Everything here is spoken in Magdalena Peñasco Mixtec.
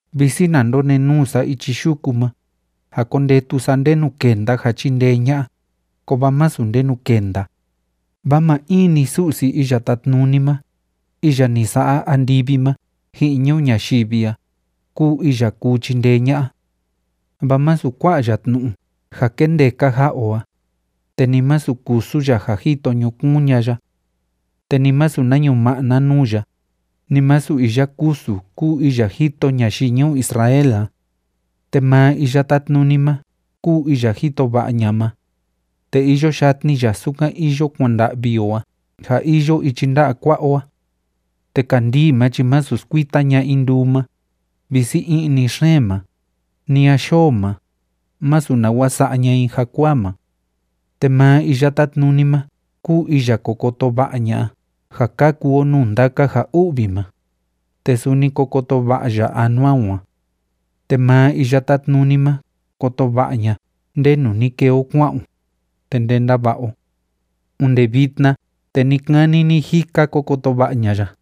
Visi na ndonenuu sa ichi yuku ma, ja kondetu sa ndenu kenda ja chindee ña'a, kovaa masu ndenu kenda, vaa maa in‑ni Su'si Iya Tátnuni ma, iya ni sa'a andivi ma ji'in ñuu ñayivi a, kúu iya kuu chindee ña'a. Vaa masu kua'a ya tnu'u ja kendeka ja'a o a, te ni masu kusu ya ja jito ñukuun ña'a ya. Te ni masu na ñuma'na nuu ya, ni masu iya kusu kúu iya jito ñayii ñuu Israel a. Te maa Iya Tátnuni ma kúu iya jito va'a ña'a ma, te iyo yatni ya sukan iyo kuanda'vi o a ja iyo ichi nda'a kua'a o a. Te kandii ma chi másu skuita ña'a i nduu ma, visi i'ni xeen ma, ni a yoo ma, masu nawa sa'a ña'a i jakuaa ma. Te maa Iya Tátnuni ma kúu iya ko koto va'a ña'a ja kaku o nuu ndaka ja u'vi ma, te suni ko koto va'a ya anua o a. Te maa Iya Tátnuni ma koto va'a ña'a ndenu ni kee o kua'an o, te ndenda va'a o. Onde vitna te ni‑kani ni‑jika ko koto va'a ña'a ya.